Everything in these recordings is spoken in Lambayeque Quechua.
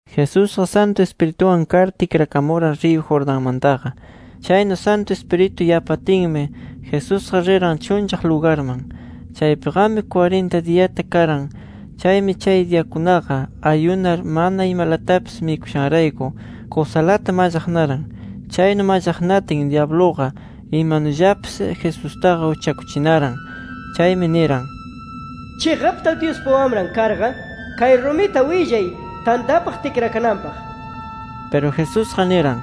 Jesusqa Santu Ispirituwan kar tikrakamuran riyu Jordanmantaqa. Chaynu Santu Ispiritu yapatinmi, Jesusqa riran chunllaq lugarman. Chaypiqami kwarinta diyata karan. Chaymi chay diyakunaqa ayunar mana imalatapis mikushanrayku kusalata mallaqnaran. Chaynu mallaqnatin, dyabluqa imanullapis Jesustaqa uchakuchinaran. Chaymi niran: —Chiqapta Dyuspa Wamran karqa, kay rumita willay tantapaq tikrakananpaq nir. Piru Jesusqa niran: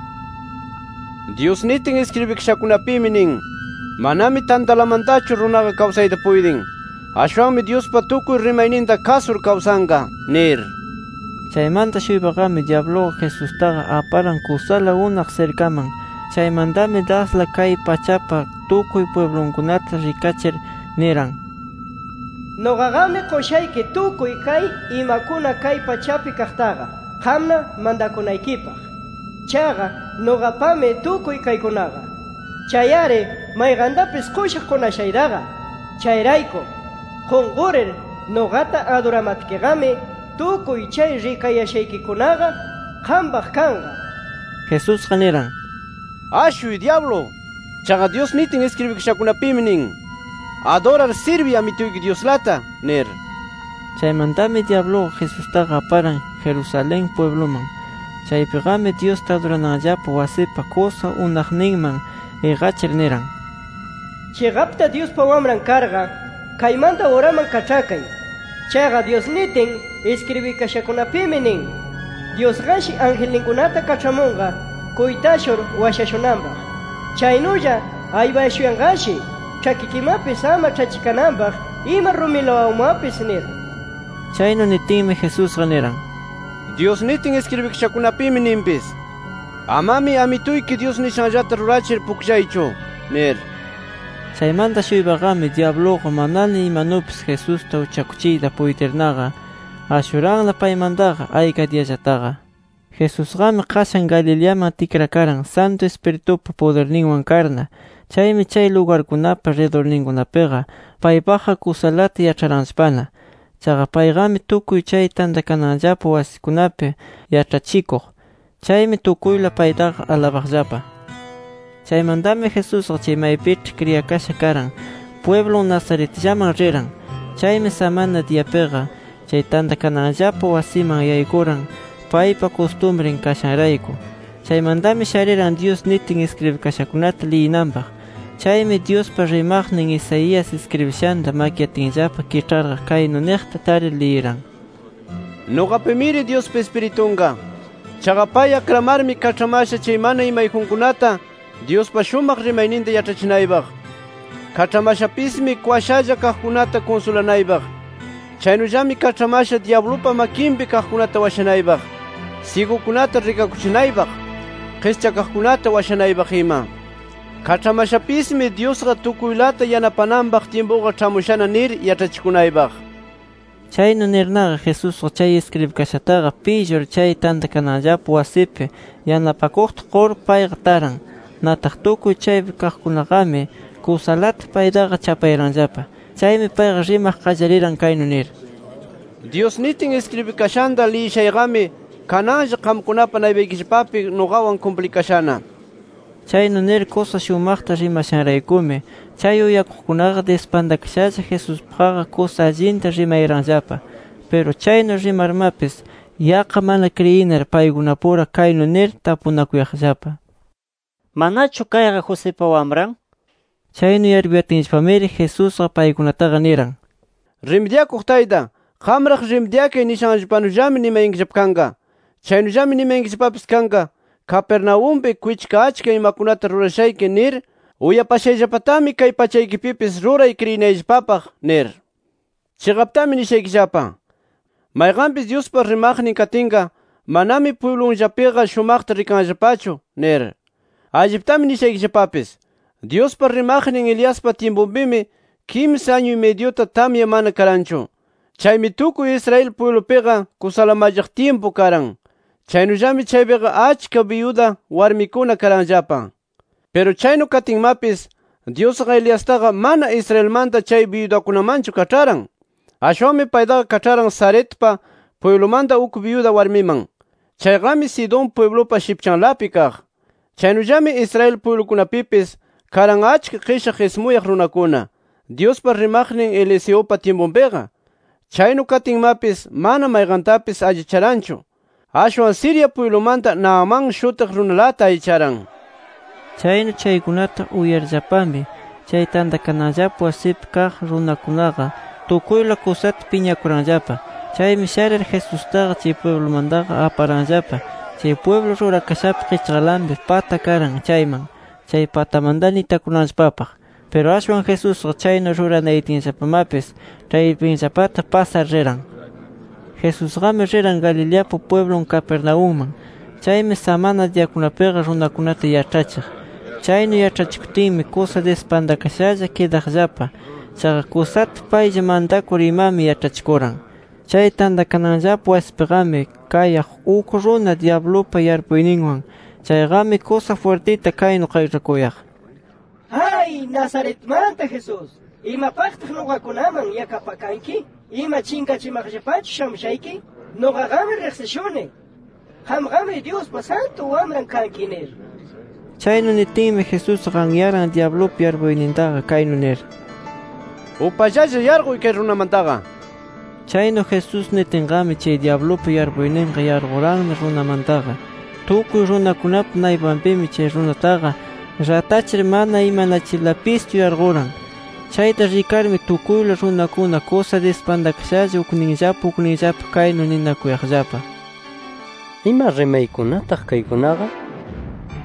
—Dyus nitin iskribikashakunapimi nin: ‘Manami tantalamantachu runaqa kawsayta puytin. [Ashwanmi Dyuspa tukuy rimayninta kasur kawsanqa]’ nir. Chaymanta-shuypaqami dyabluqa Jesustaqa aparan kusala unaq sirkaman. Chaymantami dasla kay pachapa tukuy pwiblunkunata rikachir niran: —Nuqaqami qushayki tukuy kay imakuna kay pachapi kaqtaqa, qamna mantakunaykipaq. Chaqa, nuqapami tukuy kaykunaqa. Chay-ari mayqantapis qushaq qunashaytaqa. Chayrayku, qunqurir nuqata aduramatkiqami tukuy chay rikayashaykikunaqa qampaq kanqa nir. Jesusqa niran: —[¡Ashuy dyablu!] Chaqa Dyus nitin iskribikashakunapimi nin: ‘Adurar sirbiy Amituyki Dyuslata’ nir. Chaymantami dyabluqa Jesustaqa aparan Jerusalén pwibluman. Chaypiqami Dyusta adurananllapa wasipa kusa unaqninman iqachir niran: —Chiqapta Dyuspa Wamran karqa, kaymanta uraman kaĉhakay. Chaqa Dyus nitin iskribikashakunapimi, nin: ‘Dyusqashi angelninkunata kaĉhamunqa kuytashur washashunanpaq. Chaynulla aypashuyanqashi ĉhakikimapis ama ĉhachikananpaq ima rumilawanmapis’ nir. Chaynu nitinmi, Jesusqa niran: —Dyus nitin iskribikashakunapimi ninpis: ‘Amami Amituyki Dyus nishanllata rurachir pukllaychu’ nir. Chaymanta-shuypaqami dyabluqa manana imanupis Jesusta uchakuchiyta puytirnaqa, ashuranna paymantaqa ayka diyallataqa. Jesusqami qashan Galileaman tikrakaran Santu Ispiritupa pudirninwan karna. Chaymi chay lugarkunapa ridurninkunapiqa paypaqqa kusalata yaĉharanllapana. Chaqa payqami tukuy chay tantakananllapa wasikunapi yaĉhachikuq. Chaymi tukuyla paytaqa alabaqllapa. Chaymantami Jesusqa chay maypiĉhi kriyakasha karan, pwiblun Nazaretllaman riran. Chaymi samana diyapiqa chay tantakananllapa wasiman yaykuran paypa kustumrin kashanrayku. Chaymantami shariran Dyus nitin iskribikashakunata liyinanpaq. Chaymi Dyuspa rimaqnin Isaías iskribishanta makyatinllapa kiĉharqa, kaynu niqta tarir liyiran: “Nuqapimiri Dyuspa Ispiritunqa. Chaqa pay akramarmi kaĉhamasha chay mana imayjunkunata Dyuspa shumaq rimayninta yaĉhachinaypaq. [Kaĉhamashapismi kwashalla kaqkunata kunsulanaypaq]. Chaynullami kaĉhamasha dyablupa makinpi kaqkunata washanaypaq, syigukunata rikakuchinaypaq, qischakaqkunata washanaypaq ima. Kaĉhamashapismi Dyusqa tukuylata yanapananpaq tyimpuqa ĉhamushana nir yaĉhachikunaypaq”. Chaynu nirnaqa Jesusqa chay iskribikashataqa pillur, chay tantakananllapa wasipi yanapakuqta qur payqa taran. Nataq tukuy chaypi kaqkunaqami kusalata paytaqa chapayaranllapa. Chaymi payqa rimaq qallariran kaynu nir: —Dyus nitin iskribikashanta liyishayqami kananlla qamkunapa naypaykillapapi nuqawan kumplikashana. Chaynu nir kusa shumaqta rimashanraykumi, chay uyakuqkunaqa dispantakashalla Jesuspaqqa kusa allinta rimayaranllapa. Piru chaynu rimarmapis yaqqa mana kriyinar paykunapura kaynu nir tapunakuyaqllapa: —¿Manachu kayqa Josipa wamran? nir. Chaynu yarpuyatinllapamiri, Jesusqa paykunataqa niran: —‘Rimidyakuq tayta, qamraq rimidyakay’ nishanllapanullami nimayankillapa kanqa. Chaynullami nimayankillapapis kanqa: Capernaumpi kwichka achka imakunata rurashayki nir uyapashayllapatami kay pachaykipipis ruray kriyinayllapapaq, nir. “Chiqaptami nishaykillapa: Mayqanpis Dyuspa rimaqnin katinqa, manami pwiblunllapiqa shumaqta rikanllapachu nir. Alliptami nishaykillapapis: Dyuspa rimaqnin Eliaspa tyimpunpimi kimsa añu-y-midyuta tamya mana karanchu. Chaymi tukuy Israel pwiblupiqa kusala mallaq tyimpu karan. Chaynullami chaypiqa achka byuda warmikuna karanllapa. Piru chaynu katinmapis Dyusqa Eliastaqa mana Israelmanta chay byudakunamanchu kaĉharan. Ashwanmi paytaqa kaĉharan Sarepta pwiblumanta uk byuda warmiman. Chayqami Sidón pwiblupa shipchanlapi kaq. Chaynullami Israel pwiblukunapipis karan achka qishaq ismuyaq runakuna, Dyuspa rimaqnin Eliseupa tyimpunpiqa. Chaynu katinmapis, mana mayqantapis allicharanchu. Ashwan Siria pwiblumanta Naamán shutiq runalata allicharan” nir. Chaynu chaykunata uyarllapami, chay tantakananllapa wasipi kaq runakunaqa tukuyla kusata piñakuranllapa. Chaymi sharir Jesustaqa chay pwiblumantaqa aparanllapa chay pwiblu rurakashapa qichqalanpi pata karan chayman, chay patamantana itakunanllapapaq. Piru ashwan Jesusqa chaynu ruranayatinllapamapis ĉhaypinllapata pasar riran. Jesusqami riran Galileapa pwiblun Capernaumman. Chaymi samana diyakunapiqa runakunata yaĉhachiq. Chaynu yaĉhachikutinmi kusa dispantakashalla kidaqllapa. Chaqa kusata paylla mantakur imami yaĉhachikuran. Chay tantakananllapa wasipiqami, kayaq uk runa dyablupa yarpuyninwan. Chayqami kusa jwirtita kaynu qayĉhakuq: —¡Ay! Nazaretmanta Jesús, ¿imapaqtaq nuqakunaman yakapakanki? ¿Ima, chinqachimaqllapachu shamushayki? Nuqaqami riqsishuni. ¡Qamqami Dyuspa Santu Wamran kanki! nir. Chaynu nitinmi, Jesusqa anyaran dyablupa yarpuynintaqa kaynu nir: —¡Upallalla yarquy kay runamantaqa! Chaynu Jesús nitinqami, chay dyablupa yarpuyninqa yarquranna runamantaqa. Tukuy runakunapa naypanpimi chay runataqa ratachir mana imanachirlapischu yarquran. Chayta rikarmi, tukuyla runakuna kusa dispantakashalla ukninllapa ukninllapa kaynu ninakuyaqllapa: “¿Ima rimaykunataq kaykunaqa?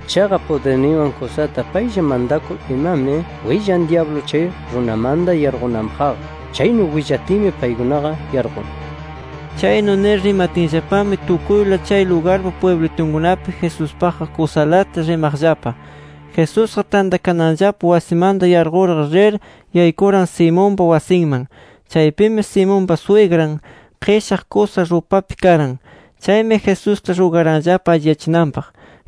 Chaqa pudirninwan kusata paylla mantakur, imami willan dyablu chay runamanta yarqunanpaqqa. ¡Chaynu willatinmi paykunaqa yarqun!” Chaynu nir rimatinllapami tukuyla chay lugarpa pwiblitunkunapi Jesuspaqqa kusalata rimaqllapa. Jesusqa tantakananllapa wasimanta yarqurqa, rir yaykuran Simonpa wasinman. Chaypimi Simonpa swigran qishaq kusa rupapi karan. Chaymi Jesusta rugaranllapa alliyachinanpaq.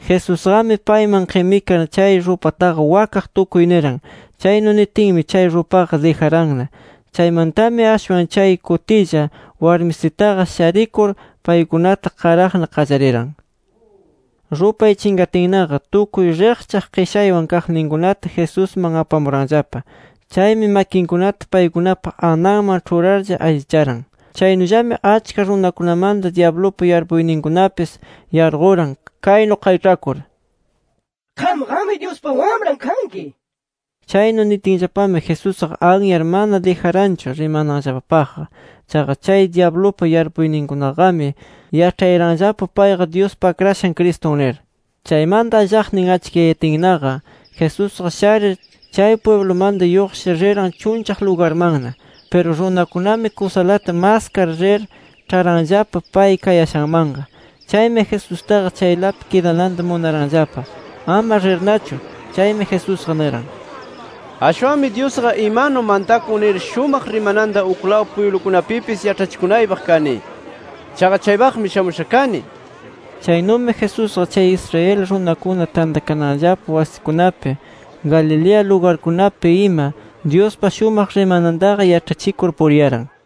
Jesusqami payman qimikar chay rupataqa wakaq tukuy niran. Chaynu nitinmi chay rupaqa dijaranna. Chaymantami ashwan chay kutilla, warmisitaqa sharikur paykunata qaraqna qallariran. Rupay chinqatinnaqa, tukuy riqchaq qishaywan kaqninkunata Jesusman apamuranllapa. Chaymi makinkunata paykunapa ananman ĉhurarlla allicharan. Chaynullami achka runakunamanta dyablupa yarpuyninkunapis yarquran, kaynu qayĉhakur: —¡Qamqami Dyuspa Wamran kanki! nirlla. Chaynu nitinllapami Jesusqa anyar, mana dijaranchu rimananllapapaqqa. Chaqa chay dyablupa yarpuyninkunaqami yaĉhayaranllapa payqa Dyuspa Akrashan Cristun nir. Chaymanta allaqnin achkiyayatinnaqa Jesusqa sharir, chay pwiblumanta lluqshir riran chunllaq lugarmanna. Piru runakunami kusalata maskar rir, ĉharanllapa pay kayashanmanqa. Chaymi Jesustaqa chaylapi kidananta munaranllapa, ama rirnachu. Chaymi Jesusqa niran: —Ashwanmi Dyusqa imanumi mantakun nir shumaq rimananta uklaw pwiblukunapipis yaĉhachikunaypaq kani. Chaqa chaypaqmi shamusha kani nir. Chaynumi Jesusqa chay Israel runakuna tantakananllapa wasikunapi, Galilea lugarkunapi ima Dyuspa shumaq rimanantaqa yaĉhachikur puriyaran.